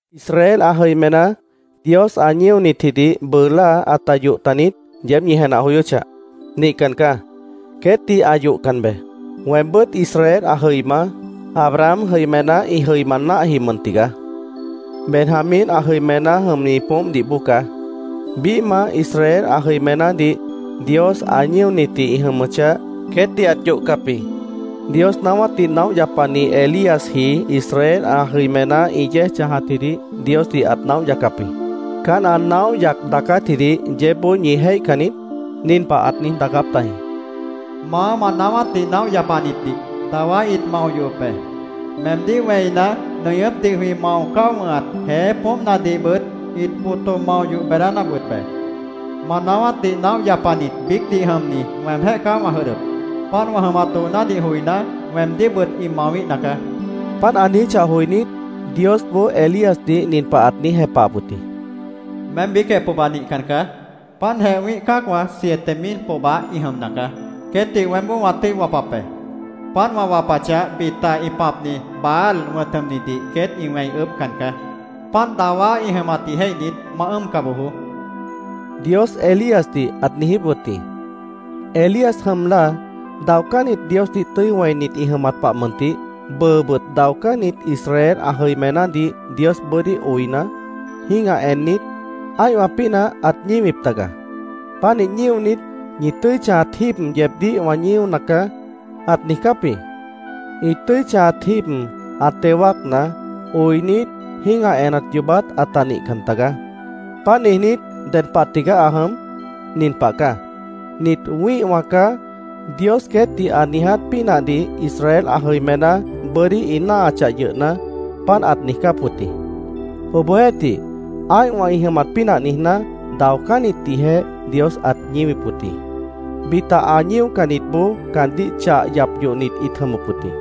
¿Israel ã jʉimená Dios ã ñíonitjidih bʉʉ láa ãta yoh taniít? yeéb ñi jenah joyóchah. ¡Nihcan caá! Queétdih ã yohcan beé. Weembʉ́t Israel ã jʉima, Abraham jʉimená ĩ jʉima náahji mʉn tigaá. Benjamín ã jʉimená jʉmni poómpdih bóo caá. Biíhmah Israel ã jʉimenádih Dios ã ñíonitji ĩ jʉmʉchah, queétdih ãt yohcap jĩ. Dios naáwátdih naóh yapani Elíasji Israel ã jʉimená ĩ yéej chãjatjidih Diosdih ãt naóh yacap jĩ. ¿Caán ã naóh yac daacátjidih yeébboó ñi jéihcan niít? Nin pah ãt niíj daacáp tajĩ: “Maá, ma naáwátdih naóh yapanitdih dawá ĩt mao yohop be. Meemdíh wẽina, nʉñʉ́pdih jwĩ mao cáo wʉ̃hat jeé poómpnadihbʉt ĩt boto mao yoh beedánap wʉt be. Ma naáwátdih naóh yapanit biícdih jʉmni weemjéh caá wã jʉdhdʉp. Páant wã jʉmat doonádih joiná, weemdíhbʉt ĩ mawíhna caá”, ãt niíj daacáp tajĩ. Páant ã niijíchah joinít, Diosboó Elíasdih nin pah ãt niíj jepahap wʉt jĩ: “Meém biícjeh pohba nihcan caá. Páantjeh wĩ́ih cã́acwã siete mil pohba ĩ jʉmna caá. Queétdih weémboó wã tʉ́i wapap be. Páant wã wapachah, bita ĩ pãpni Baal wʉ̃t jʉmnidih queét ĩ wẽi ʉʉ́bhcan caá. Páant dawá ĩ jʉmatdih jéihnit, ma ʉ́ʉmca bojoó”, Dios Elíasdih ãt niijíp wʉt jĩ. Elías jʉm láa, daocánnit Diosdih tʉ́i wẽinit ĩ jʉmat pah mʉntih, bʉʉbʉt daocánnit Israel ã jʉimenádih Dios bʉ́dí oina, jĩ́gah ennit, ã́ihwã pínah ãt ñíwip taga. Pánih ñíonit, “Ñi tʉ́i chãjat jíib yeebdíh wã ñíona caá”, ãt niijcáp jĩ. Ĩ tʉ́i chãjat jíib ã teo wáacna, oinit, jĩ́gah enat yoobát ãta nihcan tagaá. Páant niijnít, ¿ded pah tigaá ã jʉm? Nin pah caá: “Nit wĩ́ihwã caá”, Dios queétdih ã niiját pínahdih Israel ã jʉimená bʉ́dí ĩ náahachah yʉhna, páant ãt niijcáp wʉt jĩ. Obohjeéhtih, ã́ihwã ĩ jʉmat pínah niijná, daocánnitdihjeh Dios ãt ñíwip wʉt jĩ. Bita ã ñíocannitboó caandíh chah yap yohnit ĩt jʉmʉp wʉt jĩ.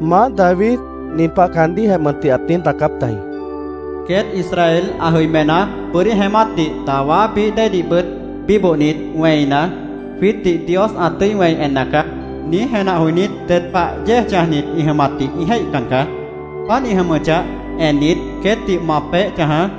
Maáh David nin pah caandíhjeh mʉntih ãt niíj daacáp tajĩ: “Queét Israel ã jʉimená bʉ́dí jeémátdih, dawá bií déedihbʉt bíbohnit, wẽina, ‘Jwiítdih Dios ã tʉ́i wẽi enna caá’, niíj jenah joinít, ded pah yéej chãjnit ĩ jʉmatdih ĩ jéihcan caá. Páant ĩ jʉmʉchah ennit, queétdih ma peéh chãjaá.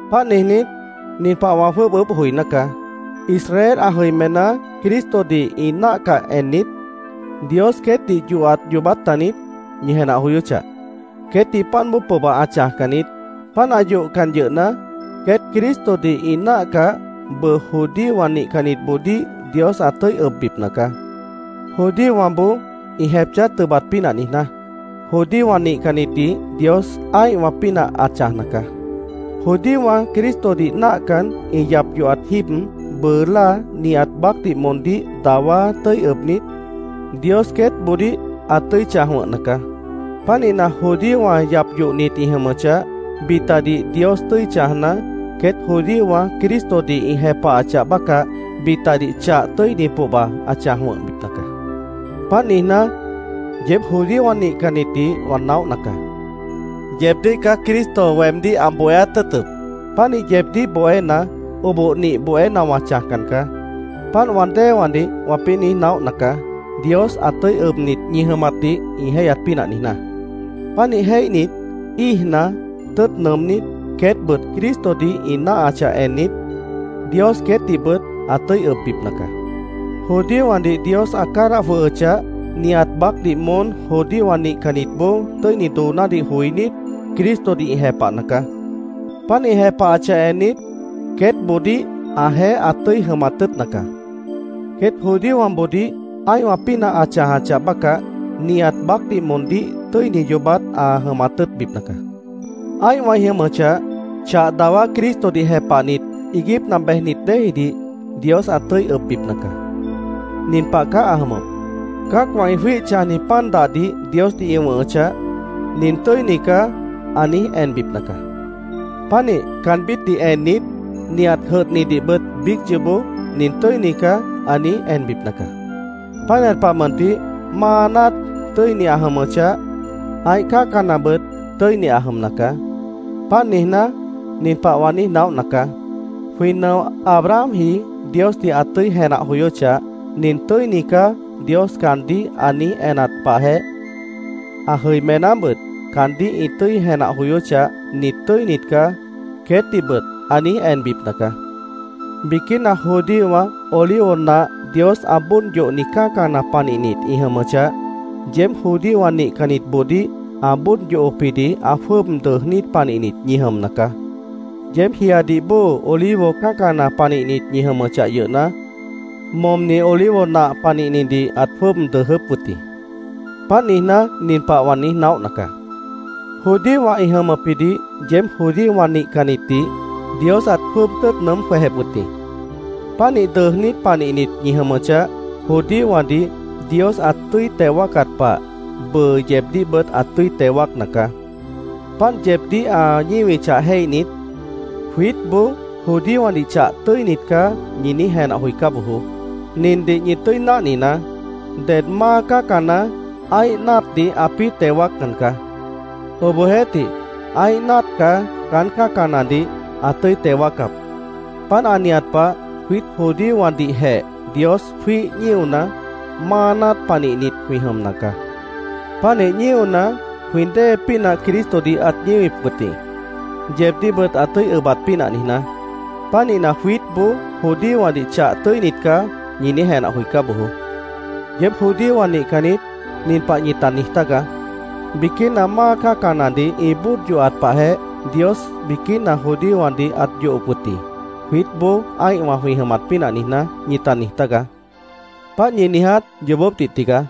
Páant niijnít, nin pah wã jwʉ́ʉb ʉʉ́bh joiná caá: Israel ã jʉimená, Cristodih ĩ náahcah ennit, ¿Dios queétdih yohat yoobát taniít? ñi jenah joyóchah. Queétdih páant bóo pohba ã chãjcan niít. Páant ã yohcan yʉhna, queét Cristodih ĩ náahcah, bʉʉ judíowã nihcannitboodíh Dios ã tʉ́i ʉbbipna caá. Judíowãboó ĩ jepchá tʉbat pínah niijná, judíowã nihcannitdih Dios ã́ihwã pínah ã chãjna caá. Judíowã Cristodih náahcan, ĩ yap yohat jíib, bʉʉ láa nihat baácdih moondíh dawá tʉ́i ʉbnit, Dios queétboodíh ã tʉ́i chãj wʉ̃hna caá. Pánihna, judíowã yap yohnit ĩ jʉmʉchah, bitadih Dios tʉ́i chãjna, queét judíowã Cristodih ĩ jepahachah bácah, bitadih chah tʉ́ini pohba ã chãj wʉ̃hbipna caá. Páant niijná, yeéb judíowã nihcannitdih wã naóhna caá. Yeebdíh caá Cristo weemdíh ã bohéát tʉ́ʉtʉp. Pánih yeebdíh bohéna, oboh nih bohéna wã chãjcan caá. Páant wã déewãdih wãpĩ́ niíj naóhna caá, Dios ã tʉ́i ʉbnit ñi jʉmatdih ĩ jéihyat pínah niijná. Pánih jéihnit, íijna, tʉ́ʉt nʉʉmnít, queétbʉt Cristodih ĩ náahachah ennit, Dios queétdihbʉt ã tʉ́i ʉbbipna caá. Judíowãdih Dios ã cádah jwʉhʉchah, nihat baácdih moón judíowã nihcannitboó tʉ́ini doonádih joinít, Cristodih ĩ jepahna caá. Páant ĩ jepahachah ennit, queétboodíh ãjeéh ã tʉ́i jʉmat tʉ́ʉtna caá. Queét judíowãboodíh ã́ihwã pínah ã chãjachah bácah, nihat baácdih moondíh tʉ́ini yoobát ã jʉmat tʉ́ʉtbipna caá. Ã́ihwã ĩ jʉmʉchah, chah dawá Cristodih jepahnit iiguípna bejnit déejidih Dios ã tʉ́i ʉbbipna caá. Nin pah caá ã jʉmʉp: Cã́acwã ĩ jwíih chãjni pan dahdih Diosdih ĩ wʉ̃hʉchah, “Nin tʉ́ini caá”, ã niíj enbipna caá. Pánih caanbítdih ennit, nihat jʉdhnidihbʉt biíc yoobó “Nin tʉ́ini caá” ã niíj enbipna caá. Pánihat pah mʉntih, máa náat tʉ́ini ã jʉmʉchah, ã́ih cã́canabʉt tʉ́ini ã jʉmna caá. Páant niijná, nin pah wã niíj naóhna caá: Jwĩ nʉo Abrahamji Diosdih ã tʉ́i jenah joyóchah, “Nin tʉ́ini caá”, Dios caandíh ã niíj enat pahjeh, ã jʉimenábʉt caandíh ĩ tʉ́i jenah joyóchah, “Nit tʉ́init caá”, queétdihbʉt ã niíj enbipna caá. Biquína judíowã olivo nah Dios ã bóod yohni cã́cana panihnit ĩ jʉmʉchah, yeéb judíowã nihcannitboodíh ã bóod yohopjidih ã jwʉ́ʉb dʉʉjnít panihnit ñi jʉmna caá. Yeéb jiadih bóo olivo cã́cana panihnit ñi jʉmʉchah yʉhna, momni olivo nah panihnidih ãt jwʉ́ʉb dʉʉjʉ́p wʉt jĩ. Páant niijná, nin pah wã niíj naóhna caá: Judíowã ĩ jʉmʉpjidih yeéb judíowã nihcannitdih Dios ãt jwʉ́ʉb tʉ́ʉt nʉʉ́m jwejep wʉt jĩ. Pánih dʉʉjnít panihnit ñi jʉmʉchah, judíowãdih Dios ã tʉ́i teo wáacat pah, bʉʉ yeebdíhbʉt ã tʉ́i teo wáacna caá. Páant yeebdíh ã ñíwichah jéihnit, “Jwiítboó judíowãdih chah tʉ́init caá”, ñi niíj jenah joicá bojoó. Nindih ñi tʉ́i náhninaá: Ded máa cã́cana ã́ih náatdih ãpĩ́ teo wáaccan caá. Obohjeéhtih, ã́ih náat caá caán cã́canadih ã tʉ́i teo wáacap. Páant ã nihat pah, jwiít judíowãdihjeh Dios jwíih ñíona, máa náat panihnit jwĩ jʉmna caá. Pánih ñíona, jwĩ dée pínah Cristodih ãt ñíwip wʉt jĩ, yeebdíhbʉt ã tʉ́i ʉbat pínah niijná. Pánihna, “Jwiítboó judíowãdih chah tʉ́init caá”, ñi niíj jenah joicá bojoó. Yeéb judíowã nihcannit nin pah ñita niij tágaá: “Biquína máa cã́canadih ĩ bóod yohat pahjeh Dios biquína judíowãdih ãt yohop wʉt jĩ, jwiítboó ã́ihwã jwĩ jʉmat pínah niijná”, ñita niij tágaá. Páant ñi niiját yoobópdih tigaá.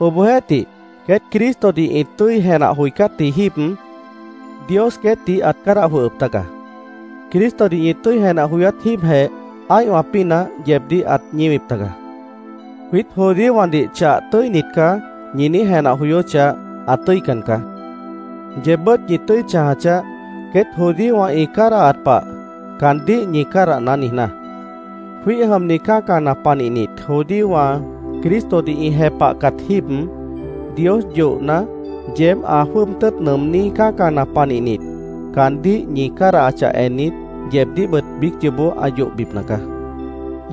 Obohjeéhtih, queét Cristodih ĩ tʉ́i jenah joicátji jíib Dios queétdih ãt cádah jwʉhʉp taga. Cristodih ñi tʉ́i jenah joyát jíibjeh ã́ihwã pínah yeebdíh ãt ñíwip taga. “Jwiít judíowãdih chah tʉ́init caá”, ñi niíj jenah joyóchah, ã tʉ́ican caá. Yeebbʉ́t ñi tʉ́i chãja chaáh, queét judíowã ĩ cádahat pah “caandíh ñi cádahná” niijná. Jwíih jʉmni cã́cana panihnit judíowã Cristodih ĩ jepahcat jíib, Dios yohna, yeéb ã jwʉ́ʉb tʉ́ʉt nʉʉmní cã́cana panihnit, caandíh ñi cádahachah ennit, yeebdíhbʉt biíc yoobó ã yohbipna caá.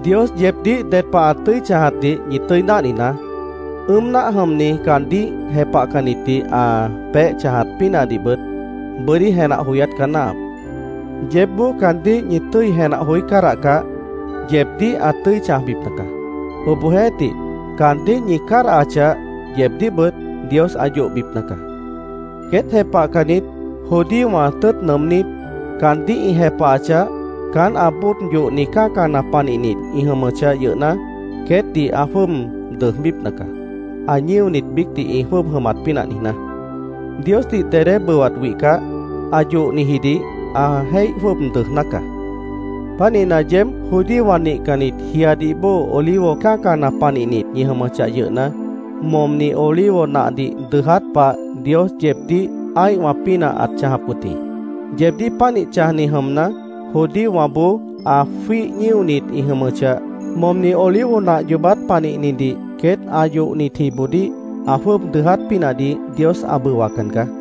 Dios yeebdíh ded pah ã tʉ́i chãjatdih ñi tʉ́i náhninaá. Ʉ́ʉm náah jʉmni caandíh jepahcannitdih ã peéh chãjat pínahdihbʉt bʉ́dí jenah joyát caá náahap. Yeébboó caandíh ñi tʉ́i jenah joí cádahcah, yeebdíh ã tʉ́i chãjbipna caá. Obohjeéhtih, caandíh ñi cádahachah, yeebdíhbʉt Dios ã yohbipna caá. Queét jepahcannit judíowã tʉ́ʉt nʉʉmnít, caandíh ĩ jepahachah, caán ã bóod yohni cã́cana panihni ĩ jʉmʉchah yʉhna, queétdih ã jwʉ́ʉb dʉʉjbípna caá, ã ñíonit biícdih ĩ jwʉ́ʉb jʉmat pínah niijná. Diosdih dedé bʉwat wihcah, ã yohnijidih ã jéih jwʉ́ʉb dʉʉjná caá. Pánihna, yeéb judíowã nihcannit jiadih bóo olivo cã́cana panihnit ñi jʉmʉchah yʉhna, momni olivo nahdih dʉʉját pah, Dios yeebdíh ã́ihwã pínah ãt chãjap wʉt jĩ. Yeebdíh pánih chãjni jʉmna, judíowãboó ã jwíih ñíonit ĩ jʉmʉchah, momni olivo nah yoobát panihnidih queét ã yohnitjiboodíh ã jwʉ́ʉb dʉʉját pínahdih Dios ã bʉwacan caá.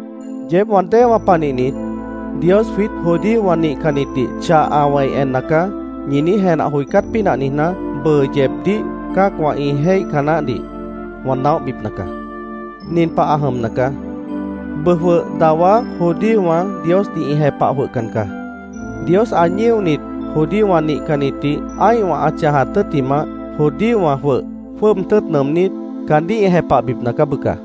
Yeéb wã déewã panihnit, “Dios jwiít judíowã nihcannitdih chah ã wẽi enna caá”, ñi niíj jenah joicát pínah niijná, bʉʉ yeebdíh cã́acwã ĩ jéihca naáhdih wã naóhbipna caá. Nin pah ã jʉmna caá: Bʉʉ jwʉh dawá judíowã Diosdih ĩ jepah jwʉhcan caá. Dios ã ñíonit judíowã nihcannitdih ã́ihwã ã chãjat tʉ́ttimah, judíowã jwʉh jwʉ́ʉb tʉ́ʉt nʉʉmnít, caandíh ĩ jepahbipna caá, bʉca.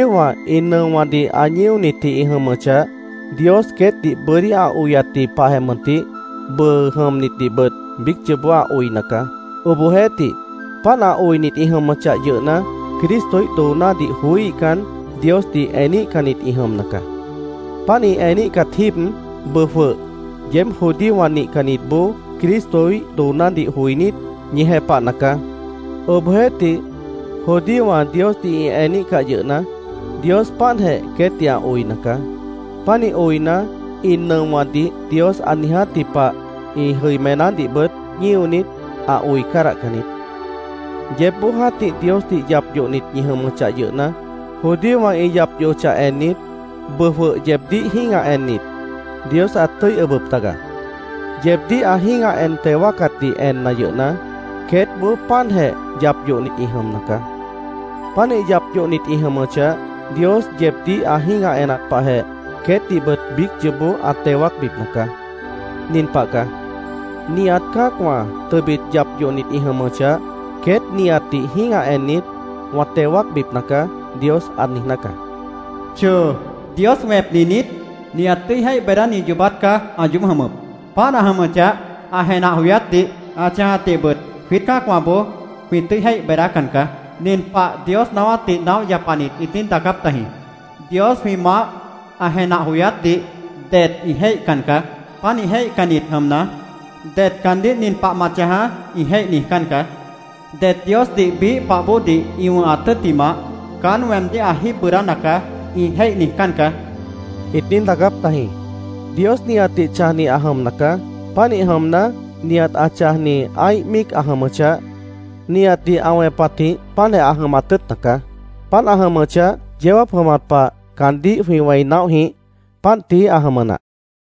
Judíowã ĩ nʉowãdih ã ñíonitji ĩ jʉmʉchah, Dios queétdih bʉ́dí ã oyatji pahjeh mʉntih, bʉʉ jʉmnitdihbʉt biíc yoobó ã oina caá. Obohjeéhtih, páant ã oinit ĩ jʉmʉchah yʉhna, Cristoíh doonádih joííhcan, Diosdih eníhcannit ĩ jʉmna caá. Páant ĩ eníhcat jíib, bʉʉ jwʉh yeéb judíowã nihcannitboó Cristoíh doonádih joinít, ñi jepahna caá. Obohjeéhtih, judíowã Diosdih ĩ eníhcah yʉhna, Dios páantjeh queétdih ã oina caá. Pánih oina, ĩ nʉowãdih Dios ã niijátji pah ĩ jʉimenádihbʉt ñíonit, ã oi cádahcan niít. Yeébboó jã́tih Diosdih yap yohnit ñi jʉmʉchah yʉhna, judíowã ĩ yap yohochah ennit, bʉʉ jwʉh yeebdíh jĩ́gah ennit, Dios ãt tʉ́i ʉbʉp taga. Yeebdíh ã jĩ́gah en teo wáacatdih enna yʉhna, queétboó páantjeh yap yohnit ĩ jʉmna caá. Pánih yap yohnit ĩ jʉmʉchah, Dios yeebdíh ã jĩ́gah enat pahjeh queétdihbʉt biíc yoobó ã teo wáacbipna caá. Nin pah caá: “Nihat cã́acwã tʉbit yap yohnit ĩ jʉmʉchah, queét nihatdih jĩ́gah ennit wã teo wáacbipna caá”, Dios ã niijná caá. ¡Choo! ¡Dios wẽpni niít! Nihat tʉ́i jéih beedáni yoobát caá ã yoób jʉmʉp. Páant ã jʉmʉchah, ã jenah joyátdih, ã chãjatdihbʉt jwiít cã́acwãboó jwĩ tʉ́i jéih beedácan caá. Nin pah Dios naáwátdih naóh yapanit ĩt niíj daacáp tajĩ: “Dios jwĩ maáh ã jenah joyátdih det ĩ jéihcan caá. Pánih jéihcannit jʉmna, det caandíh ‘Nin pah ma chãjaá’, ĩ jéih niijcán caá. Det Diosdih biíh pah bóodih ĩ wʉ̃hat tʉ́ttimah, ‘Caán weemdíh ã jíib bʉʉdána caá’, ĩ jéih niijcán caá”, ĩt niíj daacáp tajĩ. Dios nihatdih chãjni ã jʉmna caá. Pánih jʉmna, nihat ã chãjni ã́ih míic ã jʉmʉchah, nihatdih ã wẽpatjĩh páantjeh ã jʉmat tʉ́ʉtna caá. Páant ã jʉmʉchah, yeó jáap jʉmat pah caandíh jwĩ wẽi naóh jĩíh. Páant tií ã jʉmʉ nah.